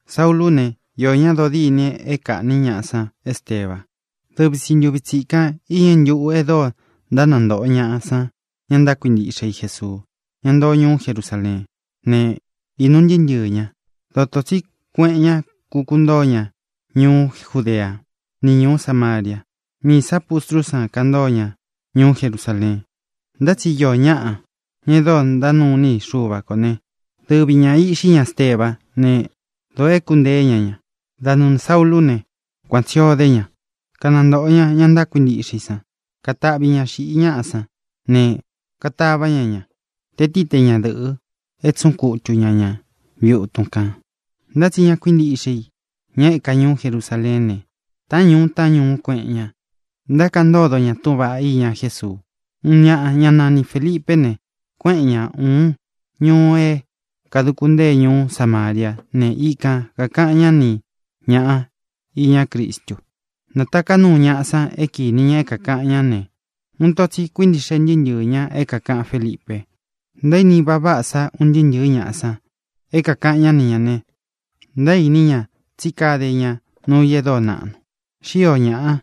Saúlū ne, iō ñá dodîni é kāꞌní ñaꞌa san Esteba. Dɨvi tsi ntūvi tsikan iñɨ ntuꞌu é dóo ntánantōꞌo ñaꞌa san ña ntákuintiꞌxe i Jesuu, ña ntoo ñuú Jerusaleen. Ne, īnu ntɨɨ́ ntɨɨ̄ ñá, dotō tsí kueꞌen ña, kukuntóo ña ñuú Judea ni ñuú Samaria. Miī sá pustrú san kantóo ña ñuú Jerusaleen. Ntá tsi iō ñaꞌa, ña é dóo ntánuu iní i Xuva kō né, dɨvi ñā iꞌxí ña Estebá ne, dōo éku nteé ña ña. Da nɨɨ̄ Saúlū né, kuan tsī ó de ña, kanantōꞌo ña ña ntákuintiꞌxe i san. Kataꞌvi ña xiꞌi ñaꞌa sán ne, katavá ña ña, te tií te ñadɨ̄ꞌɨ, é tsuꞌun kutu ña ña viꞌi utun kān. Ntá tsi ña kuíntiꞌxe i, ña e éka ñuú Jerusaleén ne, taꞌán ñuu taꞌán ñuú kueꞌen ña, ntákaꞌan ntódo ña túꞌūn vaꞌá iña Jésuu. Uun ñaꞌa, ñá nani Fēlipé ne, kuéꞌen ñā uun ñuu é kāduku ntée ñuú Samariá ne, ikan kākaꞌan ñá ni ñāꞌa iñá Cristu. Nātaká nuu ñaꞌa san é kīni ña é kākaꞌan ñá ne, uun ito tsi kuíntiꞌxe ntɨɨ́ ntɨɨ̄ ñá é kākaꞌan Félipe. Ntaíni vaꞌa váꞌa sa un ntɨɨ́ ntɨ̄ɨ́ ñaꞌa san é kākaꞌan ñá ni ñā ne, ntaíní ña tsí kade ña nuu i e dóo naꞌnu. Xíō ñaꞌa,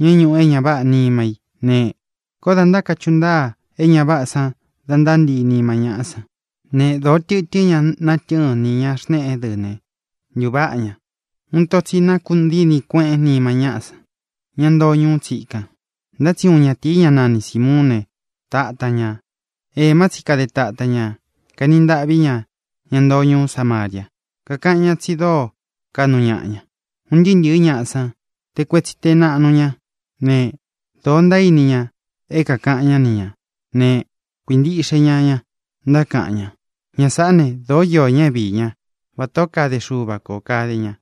ña é ñūꞌu é ña váꞌā nima í ne, koó dā ntákachuꞌu ntáa é ña váꞌā san da ntántii nima ñáꞌa san. Ne, dōo tɨtɨ́n ña natɨ́ɨn nī ña xneꞌé dɨ ne, ntuváꞌa ña. Uun ito tsi nákuꞌun dini kueꞌen nima ñáꞌa san, ña ntoo ñuu tsíkan. Ntá tsi uun ñatīi, ñá nani Sīmuún ne, tatān ña. Ēmá tsi kade tatan ña, kaeni ntaꞌví ña ña ntoo ñuú Samaria, kakaꞌan ñá tsi dóo kaꞌnu ñaꞌa ña. Un ntɨɨ́ ntɨ̄ɨ́ ñaꞌa san, te kuetsi te naꞌnu ña ne, dōó ntaíni ña é kākaꞌan ñá ni ñā ne, kuíntiꞌxe ña ña, ntákaꞌan ña: —Ña sāꞌá ne, dōó iō ñá é viī ñá. Vatā ó kade Xuva kō kade ña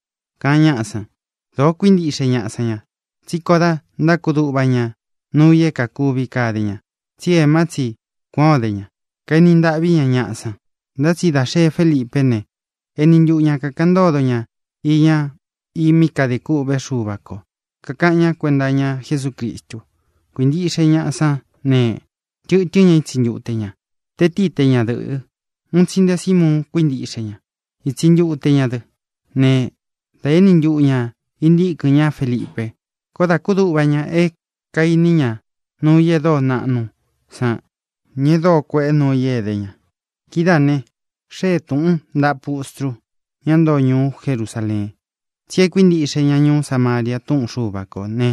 —kaꞌan ñáꞌa san. Dōo kuíntiꞌxe ñaꞌa san ña, tsí koó dā ntákudúꞌva ña nuu i é kākuvi kade ña. Tsi éma tsi kuān ó de ña, kaeni ntaꞌví ña ñaꞌa san. Ntá tsi dá xee Félipé ne, eni ntuꞌu ñā kakaꞌan ntódo ña iña i mí kadē kûꞌvé Xuva kō, kakaꞌan ñá kuenta iña Jesúcristu. Kuīntiꞌxe ñaꞌa sán ne, tɨtɨ́n ña ítsi ntute ña, te tií te ñadɨ̄ꞌɨ. Uun tsi nte Simuun kuíntiꞌxe ña, ítsi ntute ña dɨ́ ne, dā éni ntuꞌu ñā intíkɨn ñá Felipe. Koó dā kúduꞌva ña é kaīni ña nuu i é dóo naꞌnu san ni e dóo kueꞌe nuu i é edé ña. Kidáā ne, xée tūꞌun ntaꞌa pustru, ñá ntoo ñuú Jerusaleen, tsí e kuíntiꞌxe ña ñuú Samaria túꞌun Xuva kō né,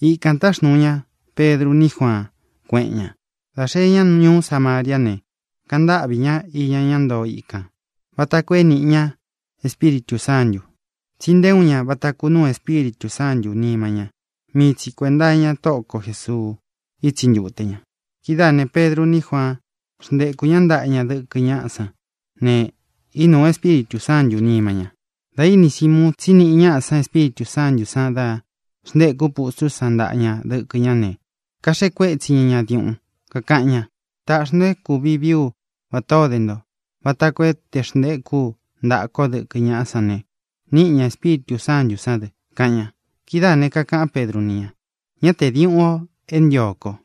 ikān táxnuu ña Pedru ní Juaan, kuéꞌen ña. Dā xee ña ñuú Samariá ne, kaꞌan ntáꞌvī ñá iña ñá ntoo ikān vata koo é nīꞌi ña Espíritū Sántū. Tsí nté uun ña vata kunūu Espíritū Sántū nima ña; mii tsi kuēnta iña Tóꞌo ko Jēsuu ítsi ntute ña. Kidáā ne, Pedru ní Juaan xntéku ña ntaꞌa ña dɨkɨ ñáꞌa san ne, inúu Espíritū Sántū nima ña. Dā íni Simuun tsí niꞌi ñaꞌa san Espíritū Sántū san dá xntéku pustrú san ntaꞌa ña dɨkɨ ñá ne, kaxeꞌe kuétsi ña ña diuꞌun, kakaꞌan ña: —Taꞌxī nto é kūvi vií u vatā ó de nto, vata koo é tē xntekú u ntaꞌa ko dɨkɨ ñáꞌá san ne, níꞌi ña Espíritū Sántū sán dɨ —kaꞌan ña. Kidáa kakāꞌán Pedru ni ña: —¡Ñá tē diuꞌun o é ntio ko!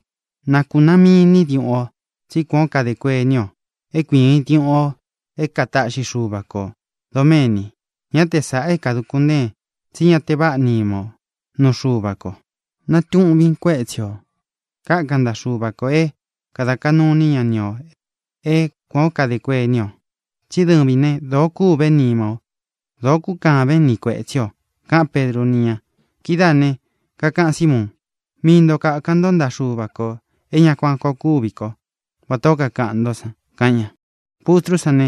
¡Na kūnaán miīn ní diuꞌun o, tsí kuān ó kadē kuení o é kuiin diuꞌun o é kataꞌxi Xuva kō doméni! Ñá te sāꞌa é kāduku ntéen, tsí ña te váꞌa nima o nuu Xuva ko. Natuꞌvin kuetsi o, kákan ntaꞌa Xuva kō é kāda kaꞌnu iní ña ni ō é kuān ó kadē kuení o. Tsí dɨvin ne, dōo kûvé nima o, dōo kúkaven ni kuētsí o —kaꞌán Pedru ni ña. Kidáā ne, kakaꞌan Símuun: —Mii nto kākan ntó ntaꞌa Xuva kō é ña kuan koo kúvi ko vatā ó kakaꞌan ntó san —kaꞌan ña. Pustrú san ne,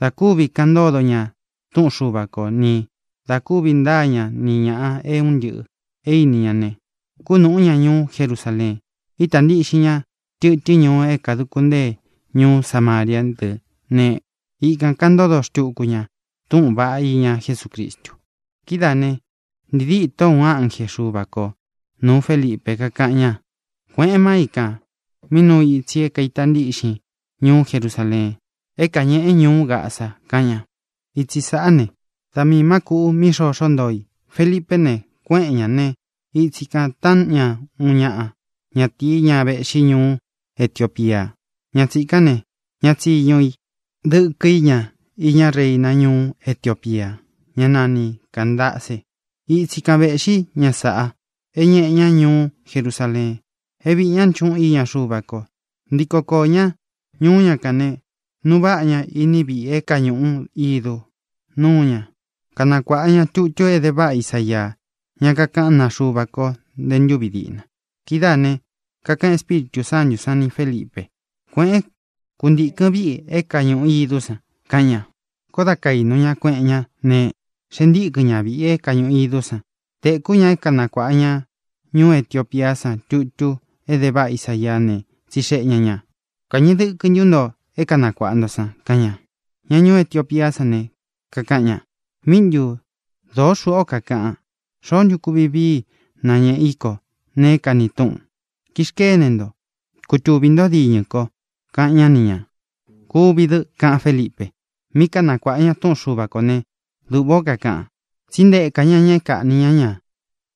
dā kúvi kaꞌan ntódo ña túꞌun Xuva ko, ni dā kúvi ntaa ña ni ñāꞌa é un ntɨꞌɨ̄ e íni ña ne, kúnūꞌú ña ñuú Jerusaleen. Ítā ntiꞌxin ña tɨtɨ́n ñuu é kāduku ntée ñuú Samariá dɨ ne, ikān kaꞌan ntódo xtuku ña túꞌūn vaꞌá iña Jesúcristu. Kidáā ne, ntii dîto uun ánje Xuva ko nūu Félipe, kákaꞌan ña: —Kuēꞌen máa i kān mí nuu ítsi é kaīta ntíꞌxin ñuú Jerusaleen é kāñeꞌe ñuú Gaza —kaꞌan ña. Itsi sāꞌá ne, da miī má kūꞌu mí xoxo ntoó i. Felipé ne, kuéꞌen ñā ne, itsi kān táꞌan ña uun ñaꞌa ñatīí, ña véꞌxi ñuú Etiopía. Ña tsīkán ne, ña tsiñu i, dɨkɨ í ña iñá reina ñuú Etiopía, ñá nani Cāndace. Itsi kan vēꞌxí ña saꞌa é ñeꞌe ña ñuú Jerusaleen é viī ñá nchuꞌún iña Xuva ko. Ntiko koō ñá ñuú ña kān ne, nuu váꞌa ña iní viꞌi é kāñuꞌu ídu. Nuu ña, kanakuāꞌa ña tutu é de váꞌa Isaía, ña kakaꞌán naa Xuva ko nte ntúvi diꞌna. Kidáā ne, kakaꞌan Espíritū Sántū sán ni Fēlipe: —Kuēꞌén, kūntikɨn víꞌi é kāñuꞌu idú san —kaꞌan ña. Koó dā kainu ña, kueꞌen ñá ne, xēe ntíkɨn ña viꞌi é kāñuꞌu idú san. Tēkú ña é kanakuāꞌa ña ñuú Etiopía san tutu é de váꞌa Isaía ne, tsixeꞌe ña ñā: —¿Kāñeꞌe dɨkɨ ntu nto é kanakuāꞌa nto san? —kaꞌan ña. Ña ñuú Etiopía san ne, kakaꞌan ña: —¿Míꞌi ntu? Dōó xuꞌū ó kakaꞌan. ¿Xoó ntu kuvi vií i nañēꞌe í ko neé kani túꞌun? Kixkene nto, kutuvī ntó diñɨ ko —kaꞌan ñá ni ñā. —Kuvi dɨ —kaꞌan Félipe. Mí kanakuāꞌa ña túꞌun Xuva kō né, duꞌvā ó kakaꞌan: Tsí ntēka ña ña é kaꞌnī ñá ña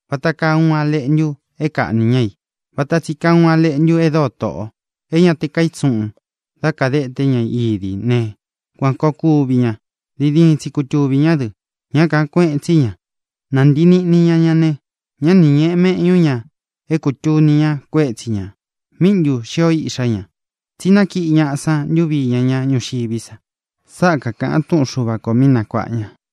vata kaa uun a leꞌntu é kāꞌni ña i; vata tsi kaa uun a leꞌntu e dóo toꞌo, é ña te kaítsuꞌūn dá kādeté ña idi i ne, kuān koo kuvi ña; diin diin tsi kutuvī ñá dɨ; ñá kāꞌan kueꞌen tsí ña. Nantii niꞌni ña ña ne, ñá ni ñēꞌe meꞌñu ña é kūtuni ña kuétsi ñā. ¿Míꞌi ntu xio iꞌxá ña? Tsí nákiꞌi ñaꞌa san ntuvi iña ña ñúxiví sa. Sáꞌa kakāꞌan túꞌun Xuva kō mí nakuaꞌa ña.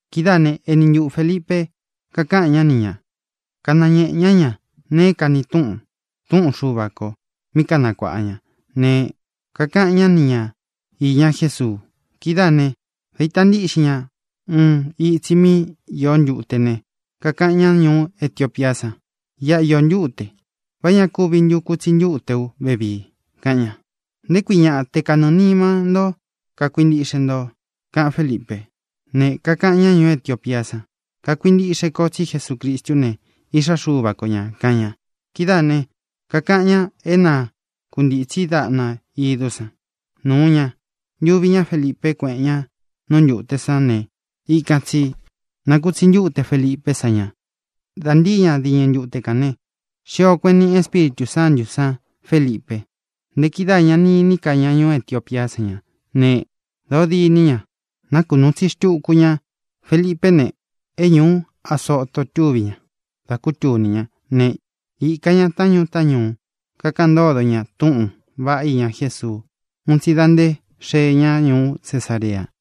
Kidáā né, eni ntuꞌu Fēlipe, kakaꞌan ñá ni ña, kanañēꞌe ñá ña nee é kani túꞌun túꞌun Xuva kō mí kanakuaꞌa ña ne, kakaꞌan ñá ni ña īña Jésuu. Kidáā né, dā ita ntíꞌxin ña uun itsi mí īo ntúte ne, kakaꞌan ñá ñuú Etiopía san: —Iꞌa īo ntúte. ¿Vá ña kuvi ntu te kutsi ntuté u vevii? —kaꞌan ña. —Nté kui ñaꞌa, te kanɨɨ̄ nima ntó kakuintiꞌxe nto —kaꞌan Félipe. Ne, kakaꞌan ñá ñuú Etiopía san: —Kakuintiꞌxé ko tsí Jesucristú ne, Iꞌxá Xuva ko ñā —kaꞌan ña. Kidáā ne, kakaꞌan ña é nākuntitsi daꞌna idú san. Nūu ña, ntuvi ñá Felipe, kuéꞌen ña nú ntute san ne, ikan tsī nakutsi ntúte Felipé san ña. Dā ntíi ña diñɨ ntute kān ne, xio kueꞌen níꞌi Espíritū Sántū san Felipe. Nte kidáā ña ni iní ka ña ñuú Etiopía san ña; ne, dōó diní ña, nakunuu itsi xtuku ña. Felipé ne, é ñūú Azoto túvi ña dá kutuni ñá ne, īka ña taꞌán ñuu taꞌán ñuu, kakaꞌan ntódo ña túꞌūn vaꞌá iña Jésuu un tsi da nté xee ña ñuú Cesarea.